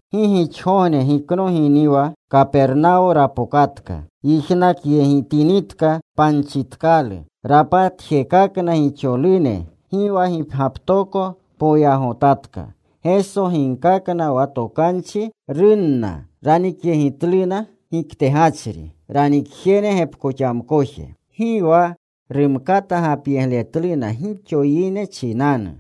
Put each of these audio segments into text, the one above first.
Gi gixogogne giknoginiwa, Kapernawo rapokatka. Yijnakyegitinitka panchitkalu, rapatjekakna gixolune. Gi wa gipgyaptoko poyagotatka. Geso ginkakna wa tokanchi. Runna. Ranikyegitluna giktegachri. Ranikjene gepkoxamkoje. Gi wa rumkata gapyegletluna gixo yine chinanu.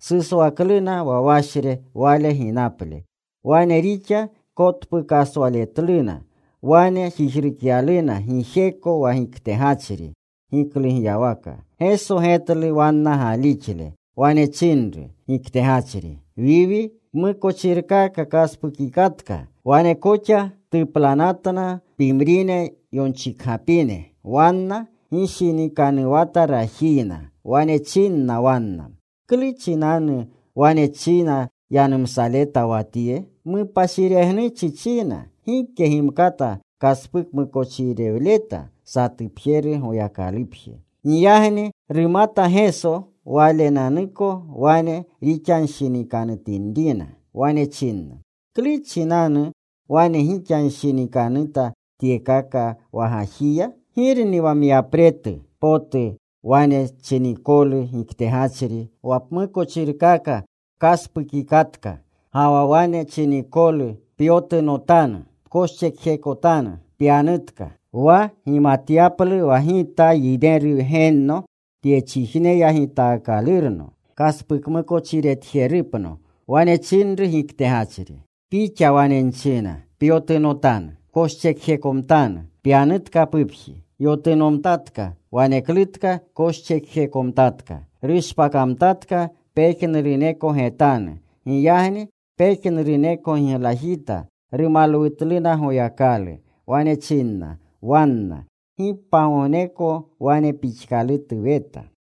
Suswakluna wa washre Wale ginaple. Wane rixa kotpukleswatluna. Wane jijrukyaluna gijeko wa giktegachri giklugyawaka. Geso getlu wanna galixle. Wane chinru giktegachri, “Wiwi, pmukochirkaka pkaspukikatka.” Wane koxa tuplanatna pimrine yonchikgapine. Wanna gishinikanuwata rajiyna. Wane chinna wanna, “¿Klu chinanu wane china yanumsaleta wa tye? Mupashiregnuchi china. Gike gimkata kaspukmukochirewleta. Satupjeru Goyakalupje.” Giyagni rumata Geso Walenanuko wane rixanshinikanutinrina. Wane china, “¿Klu chinanu wane gixanshinikanuta tyekaka wa gajiya? ¿Girni wa myapretu potu? Wane chinikolu giktegachri, ‘Wa pmukochirkaka pkaspukikatka,’ ga wa wane chinikolu, ‘Pyotunotanu. Pkoschekjekotanu. Pyanutka.’ Wa gimatyaplu wa Gita Yineru Wgenno tyechijneya gitaakalurno kaspukmukochiretjerupno,” wane chinru giktegachri, “Pixa wane nchina, Pyotunotanu. Pkoschekjekomtanu. Pyanutka pupji.” Yotunomtatka. Waneklutka koschekjekomtatka. Rushpakamtatka pejnuruneko getanu. Giyagni pejnuruneko giglajita. Rumalwutluna Goyakalu. Wane chinna wanna, “¡Gi pagogneko wane pixkalutu weta!”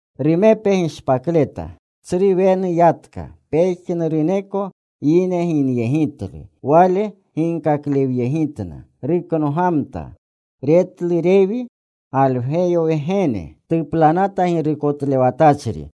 Rumepe gishpakleta. Tsru wenu yatka. Pejnuruneko yine ginyegitlu. Wale ginkaklewyegitna. Ruknogamta. Retlu Rewi Galgweyo wgene. Tuplanata girukotlewatachri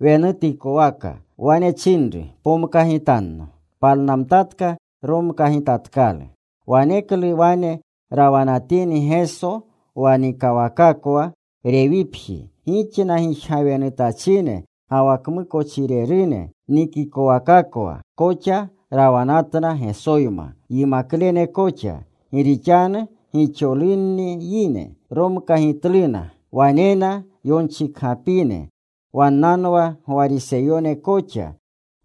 wenutikowaka. Wane chinru, “Pomkagitanno.” Palnamtatka. Romkagitatkalu. Waneklu wane rawanatini Geso wa nikawakakwa Rewipji, gixna gijgawenutachine ga wa kmukochirerune nikawakakwa koxa rawanatna Gesoyma, yimaklene koxa. Gi rixanu gixolunni yine. Romkagitluna. Wanena yonchikgapine. Wannanwa Gwariseyone koxa.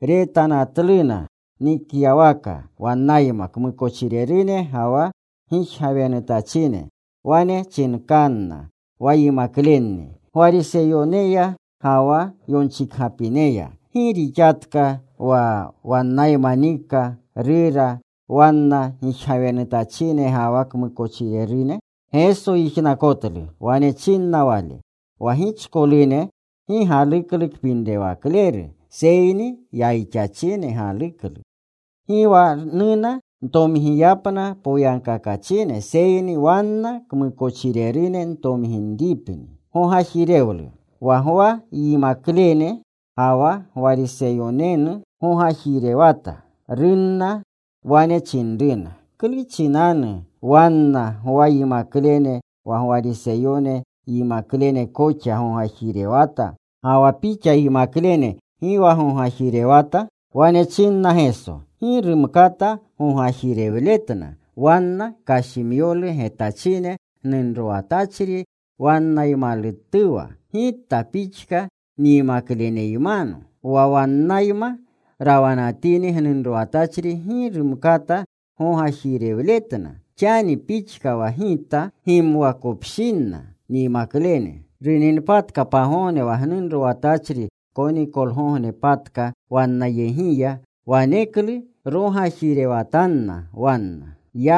Retanatluna nikyawaka wannayma kmukochirerune ga wa gijgawenutachine. Wane chinkanna wa yimaklenni Gwariseyoneya ga wa yonchikgapineya, “¿Gi rixatka wa wannayma nika, rura, wanna gijgawenutachine ga wa kmukochirerune?” Geso yijnakotlu. Wane chinna Wale, “Wa gichkolune gi galuklu kpinrewakleru, seyni yayixachine galuklu. Gi wa nuna ntomgiyapna poyagkakachine, seyni wanna kmukochirerune ntomginripni.” Wa Gwa yimaklene ga wa Gwariseyonenu gogajirewata. Runna. Wane chinruna, “¿Klu chinanu wanna Gwa yimaklene wa Gwariseyone yimaklene koxa gogajirewata, ga wa Pixa yimaklene gi wa gogajirewata?” Wane chinna Geso, “Gi rumkata gogajirewletna wanna kashimyolu getachine gnunrowatachri wannaymalutuwa, Gita pixka nyimakleneymano. Wa wannayma rawanatini gnunrowatachri gi rumkata gogajirewletna, xani pixka wa Gita gimwakopshinna nyimaklene. Runinpatka pagogne wa gnunrowatachri konikolgognepatka wannayegiya. Waneklu rogajirewatanna wanna.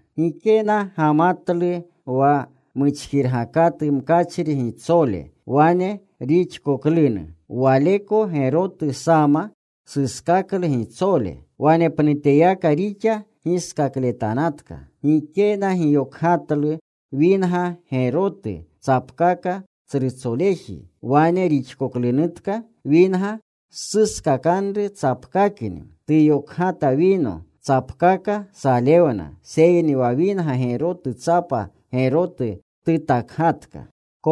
“Gikena gamatlu wa muchkirgakatu mkachri gitsole. Wane rixkoklunu, waleko gerotu sama suskaklu gitsole. Wanepnuteyaka rixa giskakletanatka. Gikena giyokgatlu winga gerotu, tsapkaka tsrutsoleji. Wane rixkoklunutka, winga suskakanru tsapkakni. Tuyokgata wino. Tsapkaka salewna. Seyni wa winga gerotu tsapa gerotu tutakgatka.”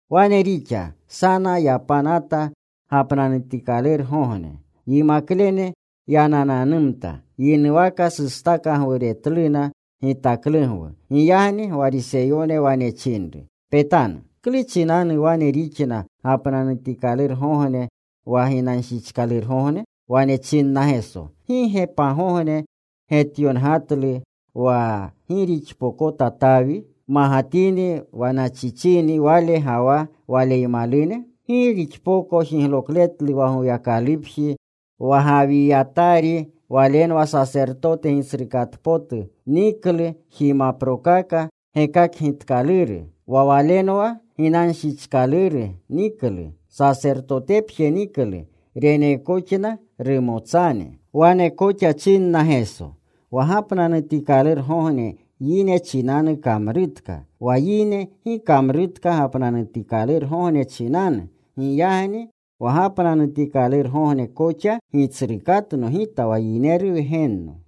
Wane rixa. Sana yapanata gapnanutikalurgogne. Yimaklene yanananumta. Yinuwaka sustakagwuremtluna gitaklugwu. Giyagni Gwariseyone wane chinru, “Petanu. ¿Klu chinanu wane rixna gapnanutikalurgogne wa ginanshichkalurgogne?” Wane chinna Geso, “¿Gi ge pagogne getyongatlu wa gi rixpokota Tawi, magatini wa nachichini wale ga wa waleymalune? Gi rixpoko jiglokletlu wa Goyakalupji, wa Gawiyatari walenwa sasertote gitsrukatpotu. Niklu jimaprokaka gekakgitkaluru. Wa walenwa ginanshichkaluru niklu. Sasertotenepje niklu. Reneekoxna rumotsane.” Wane koxa chinna Geso, “Wa gapnanutikalurgogne yine chinanu kamrutka. Wa yine gi kamrutka gapnanutikalurgogne chinanu. Giyagni wa gapnanutikalurgogne koxa gitsrukatno Gita wa Yineru Wgenno.”